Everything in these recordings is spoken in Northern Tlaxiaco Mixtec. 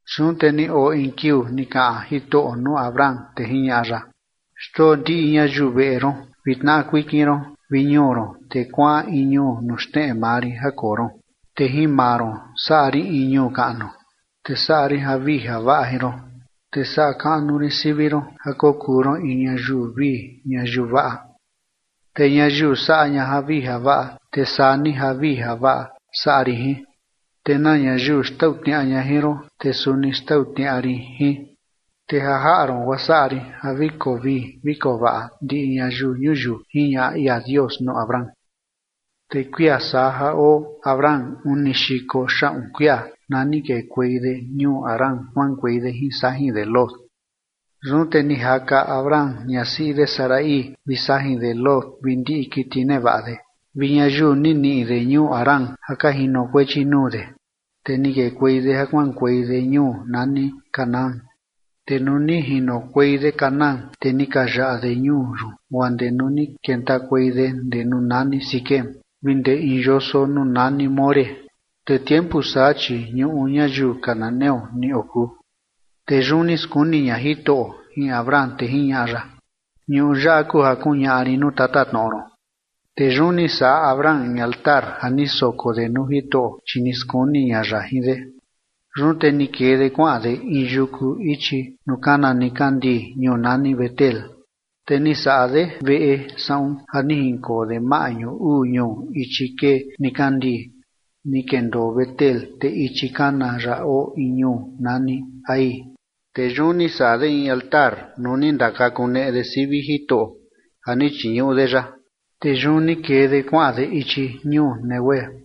Yun te ni oo in kiuu ni kaꞌan Jitoꞌo nuu Abram, te jiñaꞌa ya: ―Xndoo ndiꞌi ñayiu veꞌe ron vi tnaꞌa kuikin ron vi ñuu ron, te kuaꞌan in ñuu nuu xneꞌe maa rin ja koo ron. Te jin maa ron saꞌa rin in ñuu kaꞌnu, te saꞌa rin javii javaꞌa jin ron, te saꞌa kaꞌnu rin sivi ron ja kokuu ron in ñayiu vii ñayiu vaꞌa. Te ñayiu saꞌa ña javii javaꞌa, te saa ni javii javaꞌa saꞌa rin jin, te na ñayiu xtau tniaꞌa ña jin ron, te suni xtau tniaꞌa rin jin, te ja jaꞌa ron guaa saꞌa rin ja vi koo vii vi koo vaꞌa ndiꞌi ñayiu ñuyiu ―jiñaꞌa ia Dios nuu Abram. Te kuia saa ja oo Abram uni xiko xaꞌun kuia na ni kekuei de ñuu Harán ja kuaꞌankuei de jin sajin de Lot. Yun te ni jaka Abram ñasiꞌi de Sarai vi sajin de Lot vi ndiꞌi kiti nevaꞌa de vi ñayiu ni niꞌi de ñuu Harán ja ka jinokuechi nuu de, te ni kekuei de ja kuaꞌankuei de ñuu nani Canaán. Te nuu ni jinokuei de Canaán, te ni ka yaꞌa de ñuu yun guaa ndee nuu ni kentakuei de ndee nuu nani Siquem vi ndee in yoso nuu nani More. Te tiempu saa, chi ñuꞌu ñayiu cananeo ni okuu. Te yun ni skuni ña Jitoꞌo jin Abram, te jiñaꞌa ya: ―Ñuꞌu yaꞌa kuu ja kuñaꞌa rin nuu tatatnoꞌo ron. Te yun ni saꞌa Abram in altar ja ni soko de nuu Jitoꞌo, chi ni skuni ña ya jin de. Yun te ni kee de kuaꞌan de in yuku ichi nuu kana nikandii ñuu nani Betel, te ni saꞌa de veꞌe saꞌun ja ni jinkoo de maꞌñu uu ñuu ichi kee nikandii ni kendoo Betel, te ichi kana ya oo in ñuu nani Hai. Te yun ni saꞌa de in altar nuu ni ndakakuneꞌe de sivi Jitoꞌo ja ni chiñuꞌu de ya. Te yun ni kee de kuaꞌan de ichi ñuu Neguev.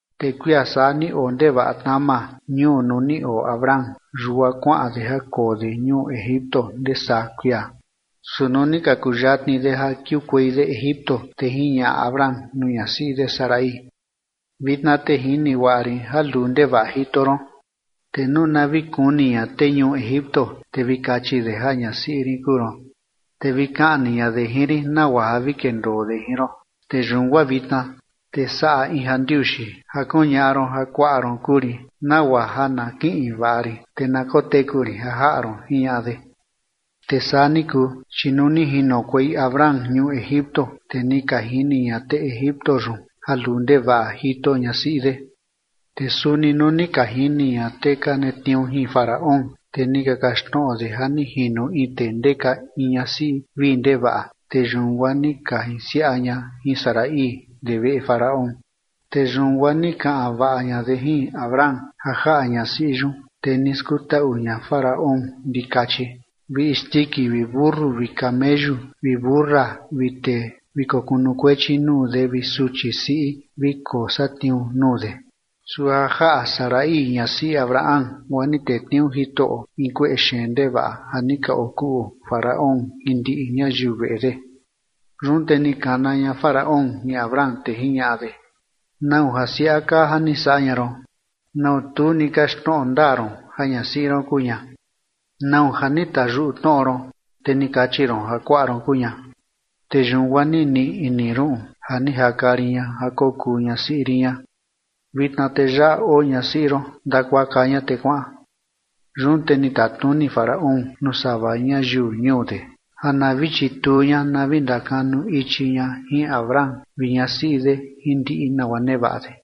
Te kuia saa ni oo ndevaꞌa tnama ñuu nuu ni oo Abram, yun guaa kuaꞌan de ja koo de ñuu Egipto ndee saa kuia. Su nuu ni ka kuyatni de ja kiukuei de Egipto, te jiñaꞌa Abram nuu ñasiꞌi de Sarai: ―Vitna te jini guaꞌa rin ja luu ndevaꞌa jito ron. Te nuu na vi kuni ña tee ñuu Egipto, te vi kachi de ja ñasiꞌi rin kuu ron, te vi kaꞌni ña de jin rin nagua ja vi kendoo de jin ron. Te yun guaa vitna te saꞌa in ja ndiuxi ja kuñaꞌa ron ja kuaꞌa ron kuu rin nagua ja na kiꞌin vaꞌa rin, te na koteku rin ja jaꞌa ron ―jiñaꞌa de. Te saa ni kuu, chi nuu ni jinokuei Abram ñuu Egipto, te ni ka jini ña tee egipto yun ja luu ndevaꞌa jito ñasiꞌi de. Te suni nuu ni ka jini ña tee ka netniuu jin Faraón, te ni ka kaxtnoꞌo de ja ni jino in tee ndeka in ñasiꞌi vii ndevaꞌa, te yun guaa ni ka jinsiaꞌa ña jin Sarai ndee veꞌe Faraón. Te yun guaa ni kaꞌan vaꞌa ña de jin Abram ja jaꞌa ñasiꞌi yun, te ni skutaꞌu ña Faraón ndikachi vi isndiki vi mentu vi kameyu vi mentu siꞌi vi tee vi kokunukuechi nuu de vi suchi siꞌi vi kosatniuu nuu de. Su ja jaꞌa Sarai ñasiꞌi Abram guaa ni tetniuu Jitoꞌo in kueꞌe xeen ndevaꞌa ja ni ka okuꞌu Faraón jin ndiꞌi ñayiu veꞌe de. Yun te ni kana ña Faraón jin Abram, te jiñaꞌa de: ―¿Nau ja siaꞌa kaa ja ni saꞌa ña ron? ¿Na tu ni kaxtnoꞌo ndaa ron ja ñasiꞌi ron kuu ña? ¿Nau ja ni tayuꞌu tnoꞌo ron, te ni kachi ron ja kuaꞌa ron kuu ña? Te yun guaa ni niꞌi ini ruꞌun ja ni jaka rin ña ja kokuu ñasiꞌi rin ña. Vitna te yaꞌa oo ñasiꞌi ron. Ndakuaka ña te kuaꞌan. Yun te ni tatnuni Faraón nuu sava ñayiu ñuu de ja na vi chituu ña na vi ndakanu ichi ña jin Abram vi ñasiꞌi de jin ndiꞌi nagua nevaꞌa de.